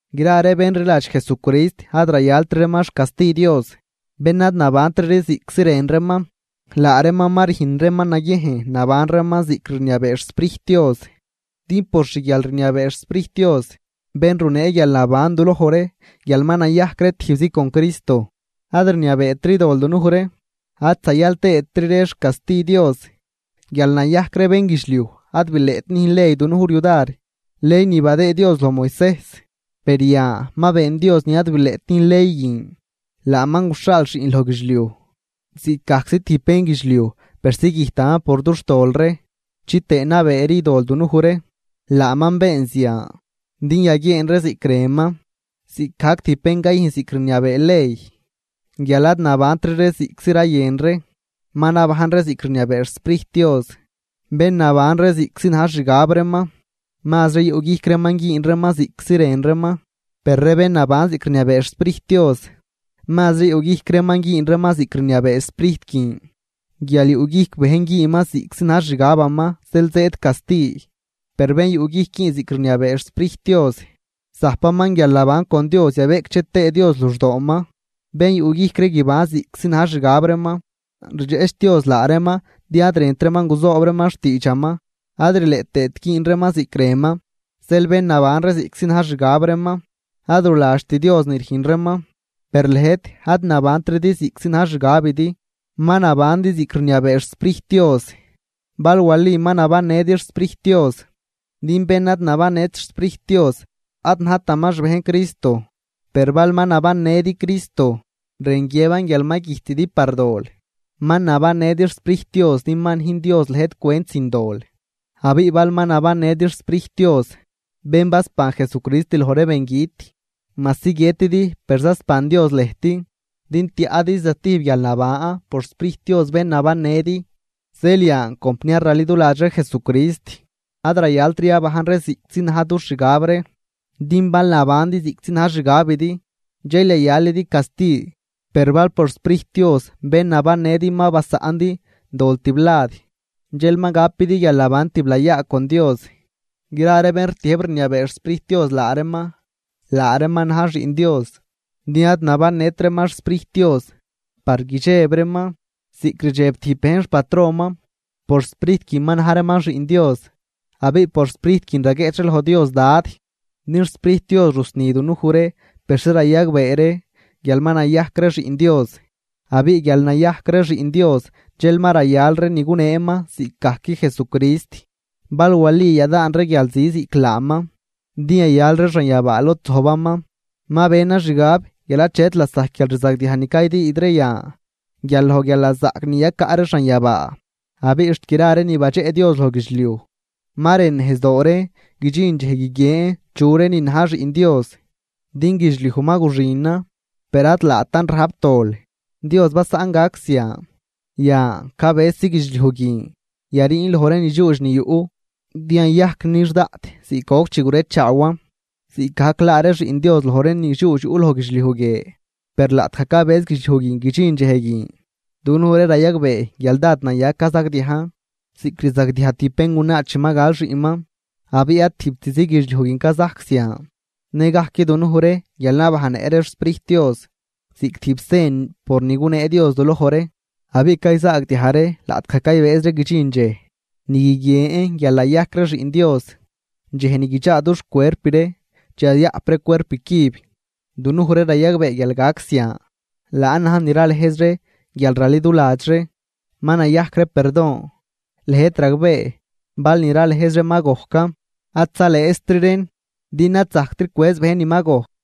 Gra ree bén rliladx Jesucrist ad rayaltri reeman xcasti Dios, bén ad nabantri ree ziꞌctzi rën reeman, laa reeman ma rüjn reeman naguiejn naban reeman ziꞌc rniabee xSprijt Dios. Din por xguialrniabee xSprijt Dios, bén runee guialnaban duloj ree guial ma nayajc ree tijbzi con Jesucrist, ad rniabeetri dol dunuj ree ad zayal tëëtri ree xcasti Dios. Guial nayajc ree bénguidxliuj ad bileꞌt nüjn ley dunuj ree yudar, ley ni badëëd Dios loj Moisejs. Per yan ma been Dios ni ad bileꞌt nüjn ley guin. Laaman guxhaal Xiꞌn loj guidxliuj ziꞌcgajczi tijb bénguidxliuj persi güjtaman por dux tol ree chitëë nabeeri dol dunuj ree. Laaman been zian, din yaguieen ree ziꞌc rënman ziꞌcgajc tijb bén cayüjn ziꞌc rniabee ley guial ad nabantri ree ziꞌctzi rayën ree, ma nabajn ree ziꞌc rniabee xSprijt Dios. Bén naban ree ziꞌctzi na̱j xixgab reeman, mazri yuꞌguijc reeman güün reeman ziꞌctzi rën reeman. Per ree bén naban ziꞌc rniabee xSprijt Dios, mazri yuꞌguijc reeman güün reeman ziꞌc rniabee Sprijt guin. Guial yuꞌguijc bejn güünman ziꞌctzi na̱j xixgabaman zeel zëëd casti. Per bén yuꞌguijc güün ziꞌc rniabee xSprijt Dios, zajpaman guialnaban con Dios yabeꞌcdxe tëë Dios luxdooman. Bén yuꞌguijc ree guiban ziꞌctzi na̱j xixgab reeman, rdxeꞌch Dios laa reeman din ad rënt reeman guzoob reeman xtiidxaman ad rileꞌ tëët güün reeman ziꞌc rënman. Zeel bén naban ree ziꞌctzi na̱j xixgab reeman, ad ruladxt Dios ni rüjn reeman. Per lëjt ad nabantridi ziꞌctzi na̱j xixgabidi, ma nabandi ziꞌc rniabee xSprijt Dios, bal wali ma nabannëdi xSprijt Dios. Din bén ad nabannët xSprijt Dios, ad najtaman xbejn Cristo. Per bal ma nabannëdi Cristo, rën guiëban guial ma güjtidi par dol, ma nabannëdi xSprijt Dios din ma nüjn Dios lëjt cwent sin dol. Abiꞌ bal ma nabannëdi xSprijt Dios, bén basban Jesucrist loj ree bengüt. Majsi guiëtidi per zasban Dios lëjt din tiaꞌdi zatijb guialnaban por xSprijt Dios bén nabannëdi. Zeel yan compniar raliduladx ree Jesucrist, ad rayaltri yabajn ree ziꞌctzi na̱j dux xgab ree. Din bal nabandi ziꞌctzi na̱j xixgabidi, dxel yayalidi casti, per bal por xSprijt Dios bén nabannëdi ma basaꞌndi dol tiblad dxel ma gapidi guialnaban tiblayaa con Dios. Gra ree bén rtiëjb rniabee xSprijt Dios laa reeman, laa reeman na̱j xiꞌn Dios. Din ad nabannët reeman xSprijt Dios par guidxeb reeman, ziꞌc rdxeb tijb bejn xpatronman, por Sprijt guin ma na̱j reeman xiꞌn Dios. Abiꞌ por Sprijt guin raguieꞌch ree loj Dios: “¡Dad!” Din xSprijt Dios rusni dunuj ree persi rayagbee ree guial ma nayajc ree xiꞌn Dios. Abiꞌ guial nayajc ree xiꞌn Dios dxel ma rayal ree ni guneeman ziꞌcgajc Jesucrist, bal wali yadaan ree guialzi ziꞌc laaman din yayal ree xanyabaa lod zojbaman. Ma benan xgab guial achet lasajc guialrzagdiaj ni caydüüd ree yan guial loj guialnazaꞌc ni yacaꞌ ree xanyabaa. Abiꞌ xt gra ree ni badxeꞌ Dios loj guidxliuj, ma rën nejzdoo reen guidxin dxej guiguien chu ree nin na̱j xiꞌn Dios. Din guidxliuj ma guxinan, per ad laatan rajp dol, Dios basaꞌn gac zian. Yan cabësi guidxliuj guin yariin loj ree ni dxuudx ni yuꞌ, din yayajc nix daꞌt ziꞌc goc chi gurechaawan, ziꞌcgajc laa ree xiꞌn Dios loj ree nidxuudx yuꞌ loj guidxliuj guie. Per laꞌtgaj cabëz guidxliuj guin guidxin dxej guin, dunuj ree rayagbee guial dád naya cazagdiajn ziꞌc rzagdiaj tijb béngunaa chi ma gal xiꞌnman. Abiꞌ ad tijbtizi guidxliuj guin cazajc zian, nëgajc dunuj ree guial nabajnnëꞌ ree xSprijt Dios ziꞌc tijb sen por ni gunee Dios duloj ree. Abiꞌ cayzaagdiaj ree laꞌtgaj caylëjz ree guidxin dxej ni guiguien guial nayajc ree xiꞌn Dios, dxej ni guidxaa dux cuerp ree chi yayaꞌp ree cuerp cüb. Dunuj ree rayagbee guial gac zian, laan na̱j ni ralëjz ree guialraliduladx ree ma nayajc ree perdon. Lëjt ragbee bal ni ralëjz ree ma gojcan, ad zalëëztri reen din ad zajctri cwëz bejn ni ma gojc.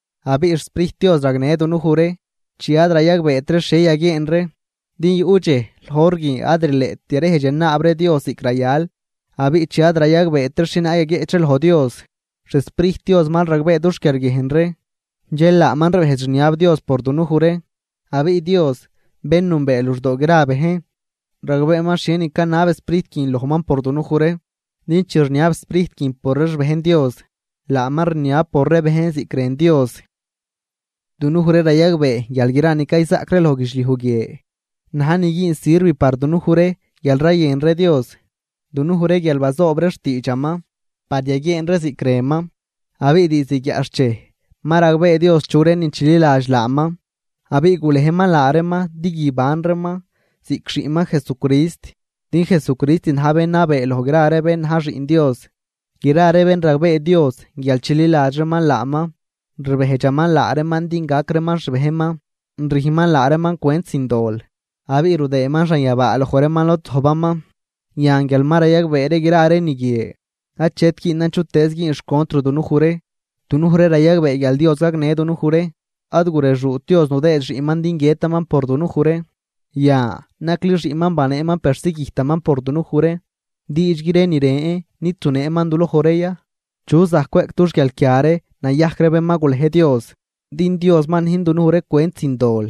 Abiꞌ xSprijt Dios ragnë dunuj ree chi ad rayagbeet ree xhie yaguieen ree, din yuꞌ dxej loj hor guin ad rileꞌt yarejdx yanaab ree Dios ziꞌc rayal. Abiꞌ chi ad rayagbeet ree xhienaag yaguieꞌch ree loj Dios, xSprijt Dios mal ragbee dux quiarguiejn ree, dxel laaman rbejdx rniab Dios por dunuj ree. Abiꞌ Dios, bén nünbee luxdoo gra ree bejn ragbeeman xhienin canab Sprijt guin lojman por dunuj ree. Din chi rniab Sprijt guin por ree xbejn Dios, laaman rniab por ree bejn ziꞌc rën Dios. Dunuj ree rayagbee guial gra ni cayzaꞌc ree loj guidxliuj guie na̱j ni güün sirv par dunuj ree guial rayën ree Dios, dunuj ree guial bazoob ree xtiidxaman par yaguieen ree ziꞌc rënman. Abiꞌ diizd guiaꞌxchej ma ragbee Dios chu ree nin chililadx laaman abiꞌ gulejman laa reeman din guiban reeman ziꞌc Xiꞌnman Jesucrist, din Jesucrist na̱j bén nabee loj gra ree bén na̱j Xiꞌn Dios. Gra ree bén ragbee Dios guial chililadx reeman laaman, rbejdxaman laa reeman din gac reeman xbejnman, rüjnman laa reeman cwent sin dol abiꞌ rudëëman xanyabaa loj reeman lod zojbaman. Yan, guial ma rayagbee ree gra ree ni guie, achet güünan chutëëz güün xcontr dunuj ree, dunuj ree rayagbee guial Dios gagnë dunuj ree. Ad gurexuut Dios nudëë Xiꞌnman din guiëtaman por dunuj ree. Yan nacli Xiꞌnman baneeman persi güjtaman por dunuj ree, ¿diidxgui ree ni ren ree nid zuneeman duloj ree ya? ¿Chu zajc cweꞌc dux guialquia ree nayajc ree bén ma gulej Dios? Din Dios ma nüjn dunuj ree cwent sin dol.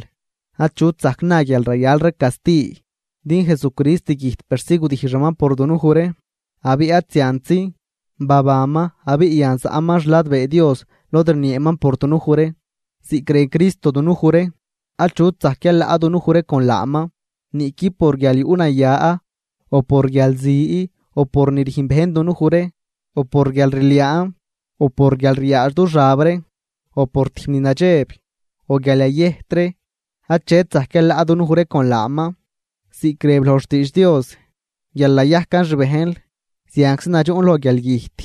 Achut zajc na guial rayal ree casti, din Jesucrist güjt persi gudijxaman por dunuj ree. Abiꞌ ad ziantzi, babanman abiꞌ yan zaꞌman xladbee Dios lod rnieeman por dunuj ree. Ziꞌc rën Cristo dunuj ree, achut zajc yalaꞌ dunuj ree con laaman. Niꞌqui por guialyuꞌnaya, o por guialzi, o por ni rüjn bejn dunuj ree, o por guialrliaan, o por guial ryaadx du xab ree, o por tijb ni nadxeb, o guial yayëjt ree, achet zajc yalaꞌ dunuj ree con laaman. Ziꞌc rëb loj xtiidx Dios: Guial nayajcan xbejnl, zianczi nadxuꞌn loj guialgüjt.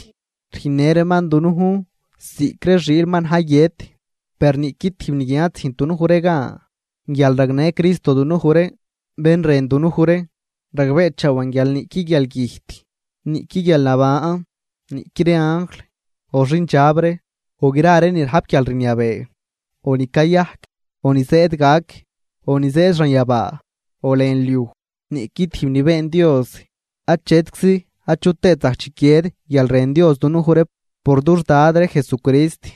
Rüjnnë reeman dunujn ziꞌc ree xiil ma na̱j guiët. Per niꞌqui tijb ni guin ad züjnt dunuj ree gan guial ragnë Cristo dunuj ree, bén rën dunuj ree. Ragbeechaawan guial niꞌqui guialgüjt, niꞌqui guialnaban, niꞌqui ree anjl, o xindxab ree, o gra ree ni rajp guialrniabee, o ni cayajc, o ni zëëd gac, o ni zëëd xanyabaa, o lën liuj, niꞌqui tijb ni been Dios, achetczi achut tëët zajc chiquied guialrën Dios dunuj ree por dux Dad ree Jesucrist.